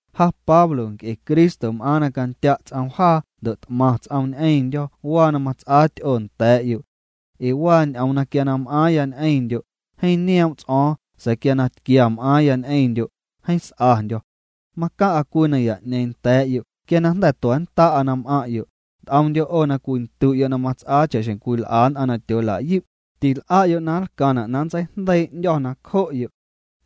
Ja Pablo, nc'e Cristo m'aaⁿ na candya' ts'oom jaa ndo' t'maⁿ ts'oom ñ'eⁿndyo̱ waa na mats'aa ty'oo nda̱a̱'yo'. Ee waa ñ'oom quia na m'aaⁿya ñ'eⁿndyo', jeeⁿ nioom' ts'o̱o̱ⁿ sa̱a̱ quia na tquia m'aaⁿya ñ'eⁿndyo', jeeⁿ s'andyo̱. Macaⁿ'a cwii naya'ñeeⁿ nda̱a̱'yo' quia na jnda̱ tua̱nnda'a na m'aⁿ'yo', nt'omndyo' 'o na cwindu'yo' na mats'aa cha'xjeⁿ cwil'a nn'aⁿ na tyoola'yu', til'a'yo' na nlcaⁿna' na nntseijndeii' 'ndyo̱ nacjo'yo'.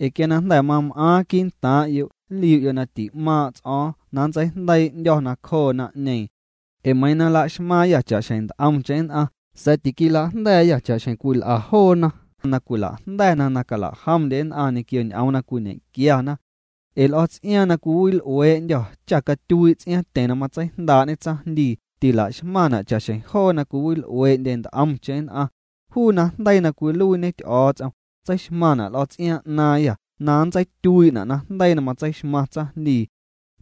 Ee quia na jnda̱ mam'aaⁿ quii'ntaaⁿ'yo' nliu'yo' na ti'maaⁿ' ts'o̱o̱ⁿ na nntseijndeii' 'ndyo̱ nacjoo naⁿ'ñeeⁿ. Ee meiiⁿ na laxmaaⁿyâ cha'xjeⁿ nt'omcheⁿ nn'aⁿ sa̱a̱ tiquila'jnda̱a̱yâ cha'xjeⁿ cwil'a joona na cwila'jnda̱na na cala'jomndye nn'aⁿ ñequio ñ'oom na cwiñequiana. Ee l'o̱ ts'iaaⁿ na cwiwil'uee'ndyô̱ cha catyuii' ts'iaaⁿtyeⁿ na matseijndaa'ñe tsaⁿjndii tila'xmaⁿna' cha'xjeⁿ joo na cwiwil'uee'ndye nt'omcheⁿ nn'aⁿ. Juu najndeii na cwiluiiñe Ty'o̱o̱ts'om, tseixmaⁿna' l'o̱ ts'iaaⁿ 'naaⁿyâ na nntseityuii'na' najndeii na matseixmaⁿ tsaⁿjndii.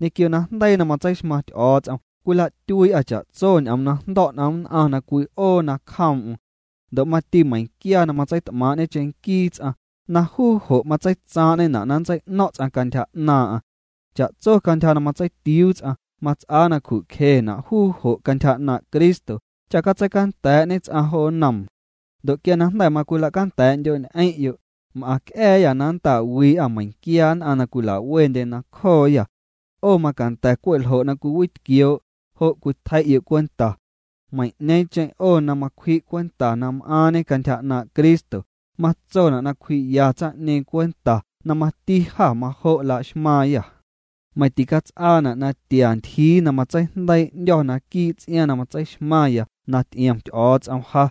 Ñequio najndeii na matseixmaⁿ Ty'o̱o̱ts'om cwila'tyuii'â cha'tso ñ'oom na jndo̱' n'om nn'aⁿ na cwi'oo nacjoom'm. Ndo' mati meiⁿquia na matseit'maaⁿ'ñe cheⁿnquii ts'aⁿ, na juu jo' matseitsaaⁿ'ñena' na nntsei'no̱ⁿ' ts'aⁿ cantyja 'naaⁿ'aⁿ. Cha'tso cantyja na matseitiuu ts'aⁿ, mats'aa na cju'cjena' juu jo' cantyja 'naaⁿ' Cristo, cha catseicanda̱a̱'ñe ts'aⁿ jo nnoom. Ndo' quia na jnda̱ macwila'canda̱a̱'ndyo'ñ'eⁿ'yo', m'aⁿc'a̱a̱yâ na nnta'wii'a meiⁿquia nn'aⁿ na cwila'wendye nacjooyâ. 'O macanda̱ cwe' ljo' na cwiwitquioo', jo' cwitjei'yo' cwenta. Meiⁿ'ñeeⁿcheⁿ 'o na macwji' cwenta na m'aaⁿñe cantyja 'naaⁿ' Cristo, matsona' na cwji'ya tsaⁿ'ñeeⁿ cwenta na mati jâ majo' la'xmaaⁿyâ. Meiⁿ ticats'aana' na tia ntyjii na matseijndeii' 'ndyo̱ naquii' ts'iaaⁿ na matseixmaⁿya na ty'iom Ty'o̱o̱ts'om ja.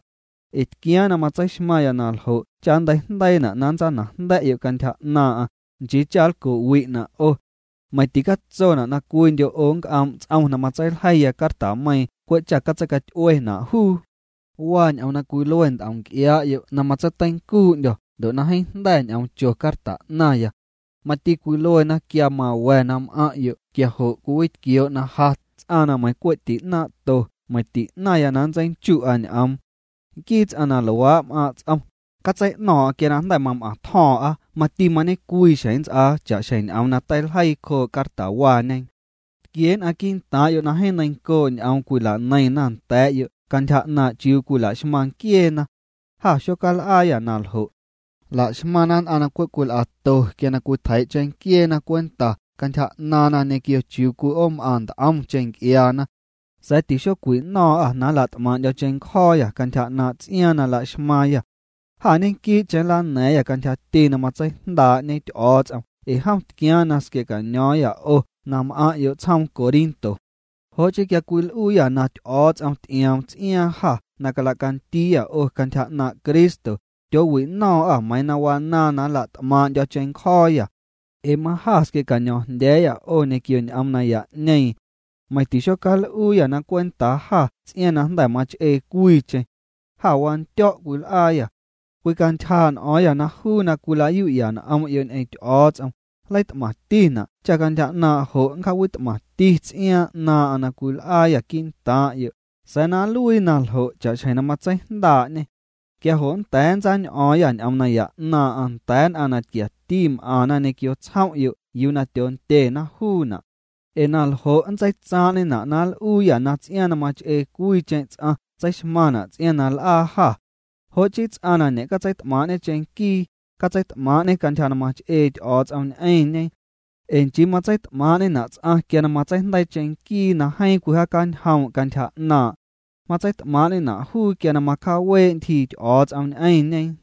Ee tquiaaⁿ na matseixmaⁿya na ljo' cha nnteijndeiina' na nntsanajnda̱'yo' cantyja 'naaⁿ'aⁿ, nchii cha nlco'wi'na' 'o. Meiⁿ ticatsona' na cwiindyo' 'o nnc'oom' ts'om na matseiljeiya cartameiiⁿ cwe' cha catseicaty'uena' juu. Waa ñ'oom na cwilue nt'om nc'iaa'yo' na matseiteincuu'ndyo̱ ndo' na jeeⁿ jnda̱ ñ'oom cho carta 'naⁿya. Mati cwiluena quia mawa̱ na m'aⁿ'yo' quia jo' cwiwitquioo' na ja ts'aⁿ na meiⁿ cwe' ti'naaⁿ'to meiⁿ ti'naⁿya na nntseichu'a ñ'oom. Nquii ts'aⁿ na luaa' m'aaⁿ' ts'om, catsei'no̱o̱ⁿ'o̱ⁿ quia na jnda̱ mam'aⁿtjo̱o̱ⁿ'a mati mañe'cwii xjeⁿ nnts'aa cha'xjeⁿ ñ'oom na teiljeii cjoo' cartawaañe. Tquie nn'aⁿ quii'ntaaⁿ'yo' na jeeⁿ neiⁿncoo' ñ'oom cwila'neiⁿna nda̱a̱'yo' cantyja 'naaⁿ' chiuu cwila'xmaⁿ nquieena. Jâ xocal'aayâ na ljo'. Laxmaⁿna nn'aⁿ na cwe' cwil'ato quia na cwitjeii' cheⁿnquieena cwenta cantyja 'naaⁿna ñequio chiuu cwi'oom'aⁿ nt'omcheⁿ nc'iaana. Sa̱a̱ tixocwino̱o̱ⁿ'â na nla't'maaⁿ'ndyo̱ cheⁿncjo̱o̱yâ cantyja 'naaⁿ' ts'iaaⁿ na laxmaaⁿyâ. Jâ ñequii'cheⁿ nlana̱a̱ⁿyâ cantyjati na matseijndaa'ñe Ty'o̱o̱ts'om ee jom tquiaaⁿ na squia̱'caño̱o̱ⁿyâ 'o na m'aⁿ'yo' tsjoom Corinto. Jo' chii quia cwil'uuyâ na Ty'o̱o̱ts'om ty'ioom ts'iaaⁿ jâ na cala'candiiyâ 'o cantyja 'naaⁿ' Cristo, tyoowino̱o̱ⁿ'â meiiⁿ na wanaaⁿ na nla't'maaⁿ'ndyo̱ cheⁿncjo̱o̱yâ. Ee majâ squia̱'caño̱o̱ⁿjndya̱a̱yâ 'o ñequio ñ'oom naya'ñeeⁿ. Meiⁿ tixocal'uuyâ na cwentaa jâ ts'iaaⁿ na jnda̱ mach'ee cwiicheⁿ. Jâ wandyo̱' cwil'aayâ. Cwicantyjaa' n'o̱o̱ⁿyâ na juu na cwilayu'ya n'om'yo' ñ'eⁿ Ty'o̱o̱ts'om, nleit'maⁿtina' cha' cantyja 'naaⁿ' jo' nncjaawit'maⁿti ts'iaaⁿ 'naaⁿ'aⁿ na cwil'aayâ quii'ntaaⁿ'yo', sa̱a̱ na nluii naljo' cha'xjeⁿ na matseijndaa'ñê. Quia jo' nnda̱a̱ nntsañ'o̱o̱ⁿyâ ñ'oom naya 'naaⁿ'aⁿ nda̱a̱ nn'aⁿ na tquiati m'aⁿna ñequio tsjom'yo' yuu na tyoondyena juuna'. Ee naljo' nntseitsaaⁿ'ñena' na l'uuyâ na ts'iaaⁿ na mach'ee cwiicheⁿ ts'aⁿ tseixmaⁿna' ts'iaaⁿ na l'aa jâ. Jo' chii ts'aⁿ na ñe'catseit'maaⁿ'ñe cheⁿnquii, catseit'maaⁿ'ñe cantyja na mach'ee Ty'o̱o̱ts'om ñ'eⁿñe. Ee nchii matseit'maaⁿ'ñena' ts'aⁿ quia na matseijndeii cheⁿnquii na jeeⁿ cwijaacanjoom' cantyja 'naaⁿ'. Matseit'maaⁿ'ñena' juu quia na macjaawee' ntyjii Ty'o̱o̱ts'om ñ'eⁿñe.